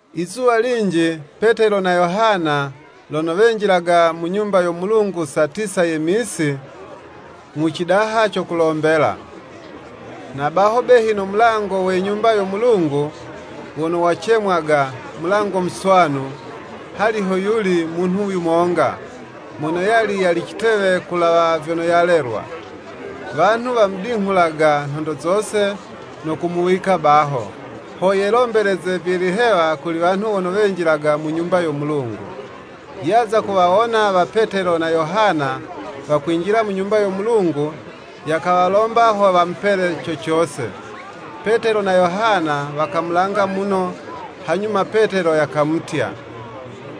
Izuwa linji Petelo na Yohana lono wenjilaga mu Nyumba yo Mulungu saa tisa ye misi, mu cidaha co kulombela. Na baho behi no mulango we Nyumba yo Mulungu, wono wucemwaga “Mulango muswanu,” hali hoyuli munhu yumonga, mono yali yali citewe kulawa vyono yalelwa. Wanhu wamudinghulaga nhondo zose, no kumuwika baho, ho yelombeleze vye lihewa kuli wanhu wono wenjilaga mu Nyumba yo Mulungu. Yaza kuwawona wa Petelo na Yohana wakwinjila mu Nyumba yo Mulungu, yakawalomba ho wamupele co cose. Petelo na Yohana wakamulanga muno, hanyuma Petelo yakamutya,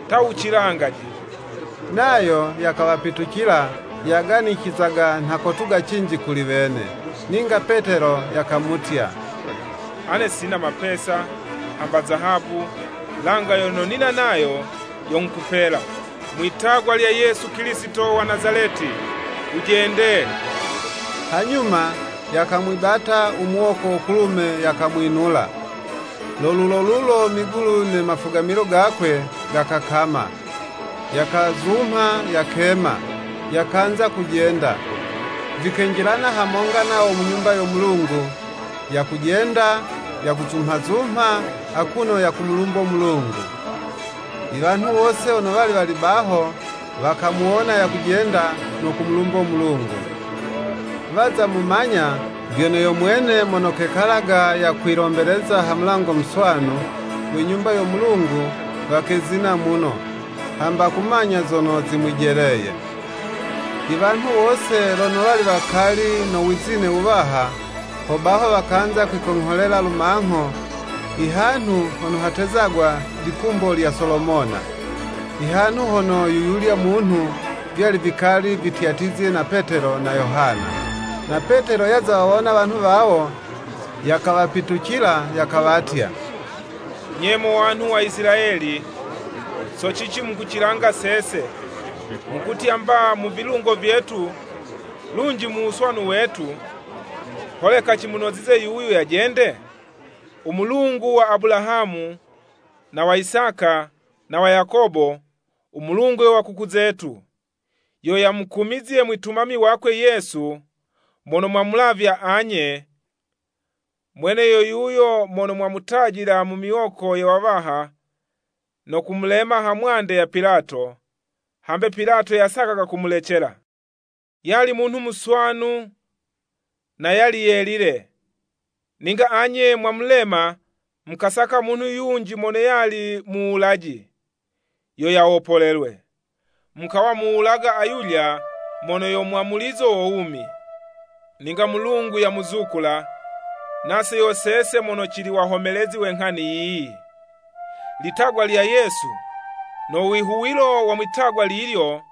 “Ta wucilangaje!” Nayo yakawapitucila, yaganicizaga nha kotuga cinji kuli wene. Ninga Petelo yakamutya, “Ane sina mapesa, hamba zahabu, langa yono nina nayo, yo nghukupela. Mwi'tagwa lya Yesu Kilisito wa Nazaleti, wujende!” Hanyuma yakamwibata u muwoko wo kulume, yakamwinula. Lo lulo lulo migulu ne mafugamilo gakwe gakakama. Yakazumha, yakema, yakanza kujenda; vikenjilana hamonga nawo mu Nyumba yo Mulungu, yakujenda, yakuzumhazumha, akuno yakumulumbo Mulungu. Iwanhu wose wono wali wali baho, wakamuwona yakujenda no kumulumbo Mulungu. Waza mumanya vyono yo mwene mono kekalaga yakilombeleza ha Mulango muswanu we Nyumba yo Mulungu, wakezina muno, hamba kumanya zono zimwijeleye. Iwanhu wose lono wali wakali no wizine wuwaha, hobaho wakanza kwikongholela lumangho i hanhu hono hatezagwa “Likumbo lya Solomona,” ihanhu hono yuyulya munhu, vyali vikali vityatyizye na Petelo na Yohana. Na Petelo yaza wawona wanhu wawo, yakawapitucila yakawatya, “Nye mo wanhu wa Isilayeli, so cici mukucilanga sese, mukutya mba, mu vilungo vyetu, lunji mu wuswanu wetu, holeka cimunozize yuyu yajende? U Mulungu wa Abulahamu, na wa Isaka, na wa Yakobo, u Mulungu we wakuku zetu, yo yamukumizye Mwitumami wakwe Yesu; mono mwamulavya anye, mwene yo yuyo mono mwamutajila mu miwoko ye wawaha, no kumulema hamwande ya Pilato, hambe Pilato yasakaga kumulecela. Yali munhu muswanu na yali yelile. Ninga anye mwamulema, mukasaka munhu yunji mono yali muwulaji yo yawopolelwe. Mukawa muwulaga ayulya mono yo mwamulizo wo wumi. Ninga Mulungu yamuzukula, nase yo sese mono cili wahomelezi we nghani yiyi. Litagwa lya Yesu, no wihuwilo wa mwi'tagwa lilyo,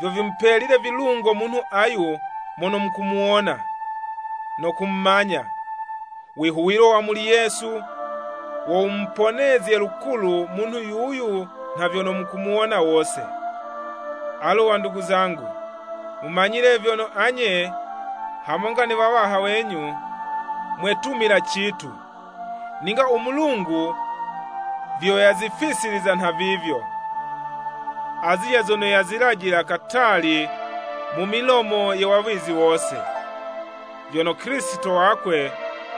vyo vimupelile vilungo munhu ayu mono mukumuwona, no kumumanya, wihuwilo wa muli Yesu, wo wumuponezye lukulu munhu yuyu nha vyono mukuwona wose. “Alu wandugu zangu, mumanyile vyono anye, hamonga ne wawaha wenyu, mwetumila citu. Ninga u Mulungu vyo yazifisiliza nha vivyo, azilya zono yazilajila katali mu milomo ye wawizi wose, vyono Kilisito wakwe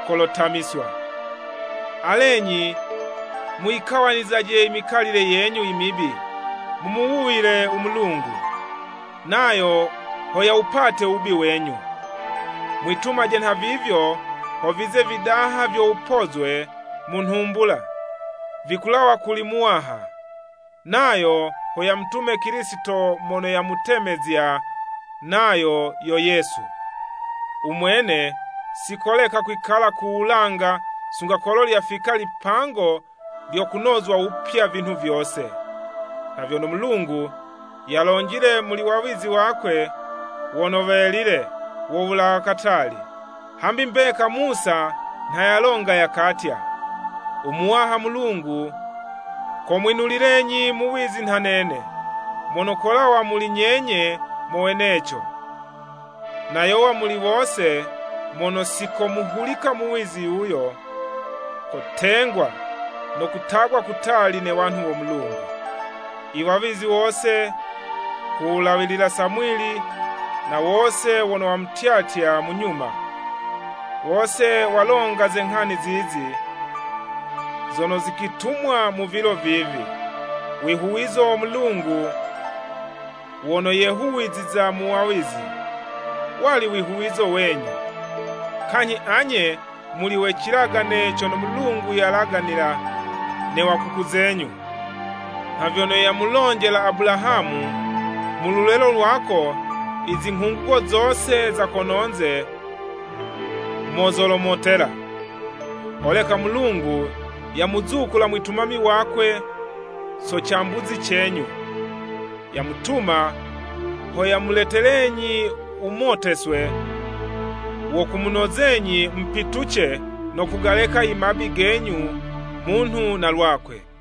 kolotamiswa. Alenyi muyikawanizaje mikalile yenyu imibi, mumuwuyile u Mulungu, nayo ho yawupate wubi wenyu, Mwitumaje nhavivyo ho vize ividaha vyo wupozwe mu nhumbula, vikulawa kuli Muwaha; nayo ho yamutume Kilisito mono yamutemezya, nayo yo Yesu. U Mwene si koleka kwikala ku wulanga sunga kolo lyafika lipango lyo kunozwa wupya vinhu vyose, nha vyono Mulungu yalonjile muli wawizi wakwe wono welile wo wulawa katali. Hambi mbeka Musa nha yalonga yakatya, ‘U Muwaha Mulungu, komwinulilenyi muwizi nha nene, mono kolawa muli nyenye mo weneco.’ “Na yowa muli wose mono si komuhulika muwizi yuyo, kotengwa no kutagwa kutali ne wanhu wo Mulungu. Iwawizi wose, ku wulawilila Samwili, na wose wono wamutyatya mu nyuma, wose walonga ze zinghani zizi zono zikwitumwa mu vilo vivi. Wihuwizo wo Mulungu wono yehuwiziza mu wawizi, wali wihuwizo wenyu, kanyhi anye muli we cilagane cono Mulungu yalaganila ne wakuku zenyu, nha vyono yamulonjela Abulahamu, ‘Mu lulelo lwako izinghungugo zose za kono'nze mo zolomotela.’ Holeka Mulungu yamuzukula Mwitumami wakwe so cambuzi cenyu, yamutuma ho yamuletelenyi wumoteswe wo kumunozenyi mupituce no kugaleka imabi genyu munhu na lwakwe.”